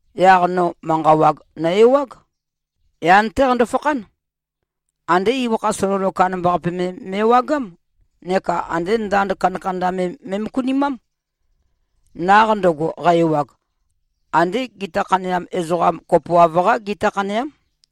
Yaq no manqa wag nø-ewág. Yan-té qando-fakhán. Andé ibøkha sololo kandambaqape me me꞉wagám neka ande ndand kandakanda me me꞉møkunimám. Naq ndøgo, qæ-ewag, andé gita khaneam ezoqam kopoav-qá gita khaneám.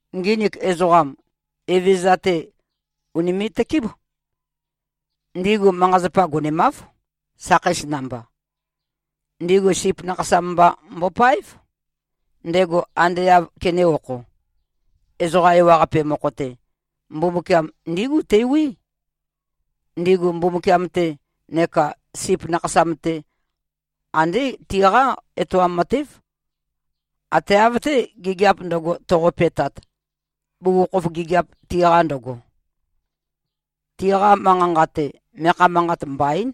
Nginik ezoqam, Evezøza-te ùnime꞉-tøkéb. Ndigu manqa-zapa gonemáv, sakheis namba. Ndigu Sip Nakhasam mba mbopáev, ndego ande āv kenē-okho. Ezoqa ewaqape mokho-te, Mbumbukiam ndígu tewí. Ndigu Mbumbukiam-te neka Sip Nakhasam-te, andé tiqá etoam matév, ate av-té, gigiap ndøgo, toqope꞉tat, bugukhokhof gigiap tiqa ndøgo. Tiqa manqa-nqa-te, meakha manqat mbaín,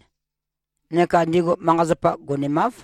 neka ndigu manqa-zapa gonemáv.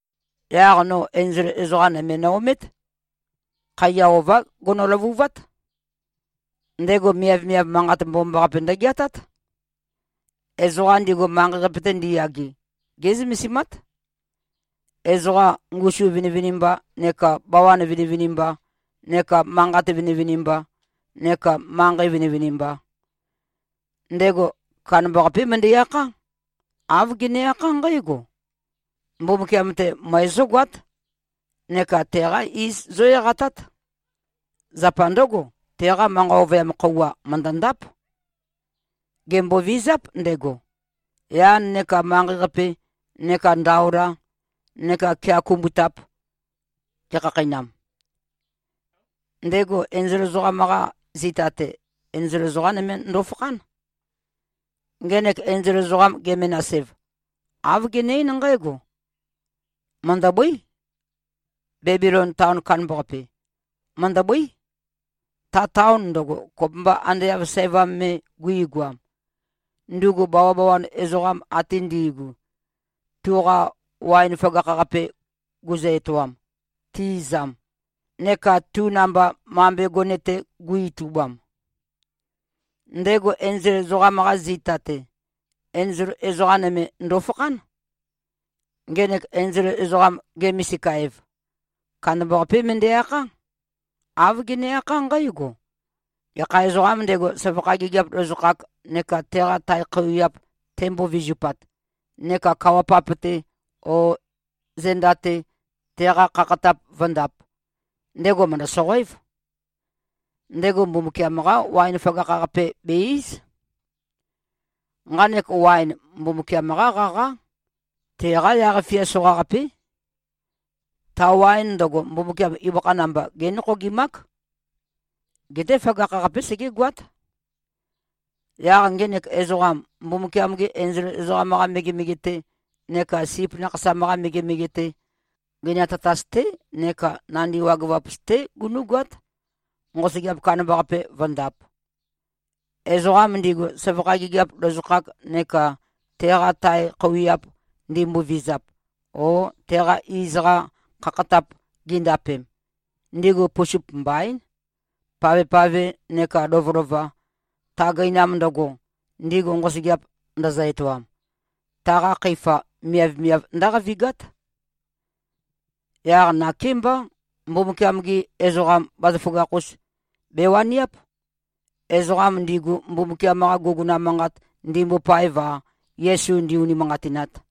Yaq no enzol ezoqa nøme no-omét. Khaiya ová gono-løvuvát. Ndego miavmiav manqat mbomambaqape ndøgeatát. Ezoqa ndigu, manqei-qape-te ndiyage, gé꞉zømesimát, ezoqa ngusu vinivinimba neka bawan vinivinimba neka manqat vinivinimba neka manqei vinivinimba. Ndego kandambaqapé møndæ-akhá. Āv gene-akhá nqǽgo, “Mbumbukiam-te møe zógoát, neka teqá iz zó-eqatát. Zapa ndǿgo, teqa manqa ovøyam khøuwa, mø̀ndøndáp. Gèmbovizáp ndego, yan neka manqei-qape neka ndaola neka kea kumbutap gekhakheinam.” Ndego enzol ezoqam-qa zita-te, enzol ezoqa nøme ndofakhán. Ngenek enzol ezoqam, ge-menas-ev, āv gene-eín nqǽgo, “Mø̀ndøbøí. Bebilon taon kandambaqape, mø̀ndøbøí, ta taon ndøgo, kopømba ande av sævam me guigoam, ndugu bawabawan ezoqam ate ndigu, tuqa waen føgakh-qape guzø-etoam, ti-izam, neka tu namba mambe gone-te gu-itubam.” Ndego enzol ezoqam-qa zita-te, enzol ezoqa nøme ndofakhán. Ngenek enzol ezoqam, ge-misika-ev, kandambaqapé møndæ-akhá. Āv gene-akhá nqǽgo, “Gekha ezoqām ndego, søvakha gigiap lozokhak neka teqa tae khøuwiap tembo-vizupat, neka kawa-pap-te o zenda-te teqa khakhatap vǿndāp, ndego mø̀ndø-soqoév. Ndego Mbumbukiam-qá waen føgakh-qape be-íz. Nqanek waen, Mbumbukiam-qá qaqá. Teqá yaq-fia soqaqapé. Ta waen ndøgo, Mbumbukiam ibøkha namba, génokhogimák. Geté føgakh-qapé segégoát. Yaq ngenek ezoqam, Mbumbukiam-gi enzol ezoqam-qa megemege-te neka Sip Nakhasam-qa megemege-te, gøinam tatas-té neka nandi wagøvap-us-té gunú꞉goát, nqosøgeap kandambaqape vǿndāp. Ezoqam ndigu, søvakha gigiap lozokhak neka teqa tae khøuwiap ndimbovizap, o teqa iz-qa khakhatap gindapem, ndigu pusup mbaín. Pavpave nekā lovølova, ta gøinam ndøgo, ndigu nqosøgeap ndøzø-etoam, taqa khøifa miavmiav ndǿqavigát.” Yaq nakémbá, Mbumbukiam-gi ezoqam bazaføgakh-us bewaniáp, ezoqam ndigu Mbumbukiam-qa guguna manqat ndimbopaev-a, Yesu ndī-ūnīmānqātināt.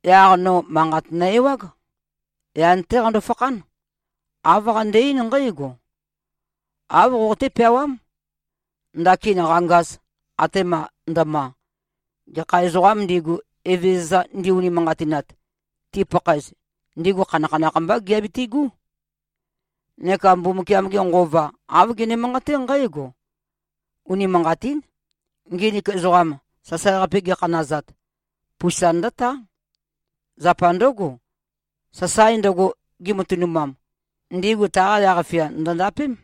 Yaq no manqat nø-ewág. Yan-té qando-fakhán. Āv qande-eín nqǽgo, “Āv qoqoté-peawám: Ndakin qangaz, atema ndøma, gekha ezoqām ndigu, Evezøza ndi-unimanqatinat, tipakhaez, ndigu khanakhanakh mbá giabitigú.” Neka Mbumbukiam-ge Nqova, āv gene-manqaté nqǽgo, “Unimanqatín. Nginik ezoqam, sasae-qape gikhanazat, pusa ndǿtá. Zapa ndǿgo, sasae ndøgo gi꞉matønumam, ndigu taqa yaq-fia, ndø̀ndapém.”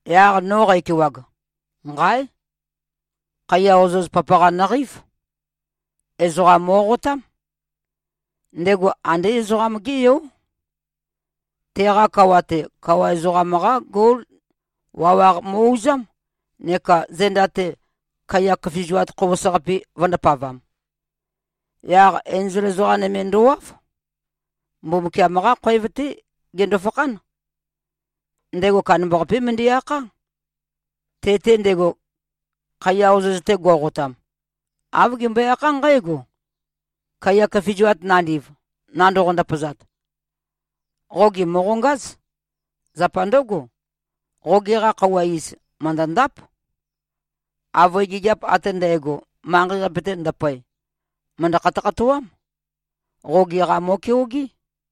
Yaq no qækewag, nqáe! Khaiya ozoz papaqa nøqeív. Ezoqam mo꞉qotám. Ndego andé Ezoqam-gé Yó. Teqa kawa-te, kawa ezoqam-qá gol wawaq mo꞉-uzám, neka zenda-te, kaiya køfizuat khobos-qapi vø̄ndapavam. Yaq enzol ezoqa nøme ndowáv. Mbumbukiam-qá khoev-té gendo-fakhán. Ndego kandambaqapé møndæ-akhá. Te-te ndego, khaiya ozoz-te go꞉qotam, āv gembøe-akhá nqǽgo, “Kaiya køfizuat nandiv, nandoqo-ndøpazat, qoge mòqongáz. Zapa ndǿgo, qoge-qa khøuwa iz, mø̀ndøndáp. Avøe gigiap ate ndægo, manqei-qape-te ndøpoe, mø̀ndø-khatøkhatoám. Qoge-qa mo꞉keogé.”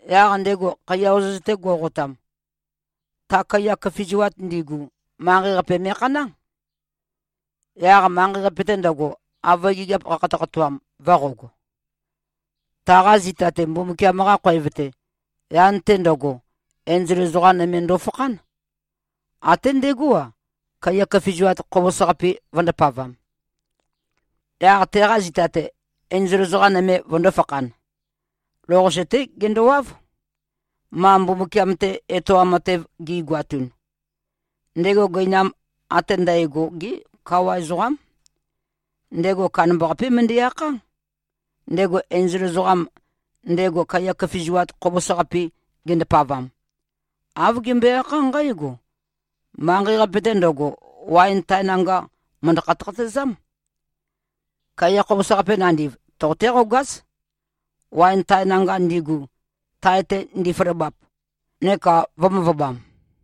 Yaq ndego khaiya ozoz-te go꞉qotam, ta kaiya køfizuat ndigu, manqei-qape me꞉khaná. Yaq manqei-qape-te ndøgo, avøe gigiap qakhatøkhatoam, vø̄qog. Taqa zita-te, Mbumbukiam-qa khoev-te, yan-te ndøgo, enzol ezoqa nøme ndofakhán. Até ndegó-a, kaiya køfizuat khobos-qapi vø̄ndapavam. Yaq teqa zita-te, enzol ezoqa nøme vøndō-fakhan. Lou-qase-té gendowáv, ma Mbumbukiam-te etoam matev gi꞉goatun. Ndego gøina ate ndægo-gé kawa ezoqám. Ndego kandambaqapé møndæ-akhá. Ndego enzol ezoqam, ndego kaiya køfizuat khobos-qapi gendapavam, āv gembøe-akhá nqǽgo, “Manqei-qape-te ndøgo, waen tae nanga mø̀ndø-khatøkhatøezám. Kaiya khobos-qapi nandiv, toqoté-qogáz, waen tae nanga ndigu, tae-te ndifaløbap. Neka vø̄-møvøbam.”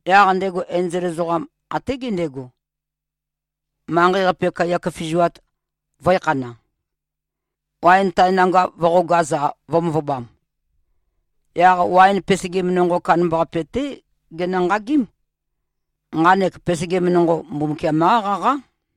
Yaq ndego enzol ezoqam, até gendego, manqei-qape, kaiya køfizuat vø̄ekhana, waen tae nanga vø̄qogaz-a, vø̄-møvøbam. Yaq waen pesegim nonqo kandambaqape-té genø-nqagím. Nqanek pesegim nonqo, Mbumbukiam-qá qaqá.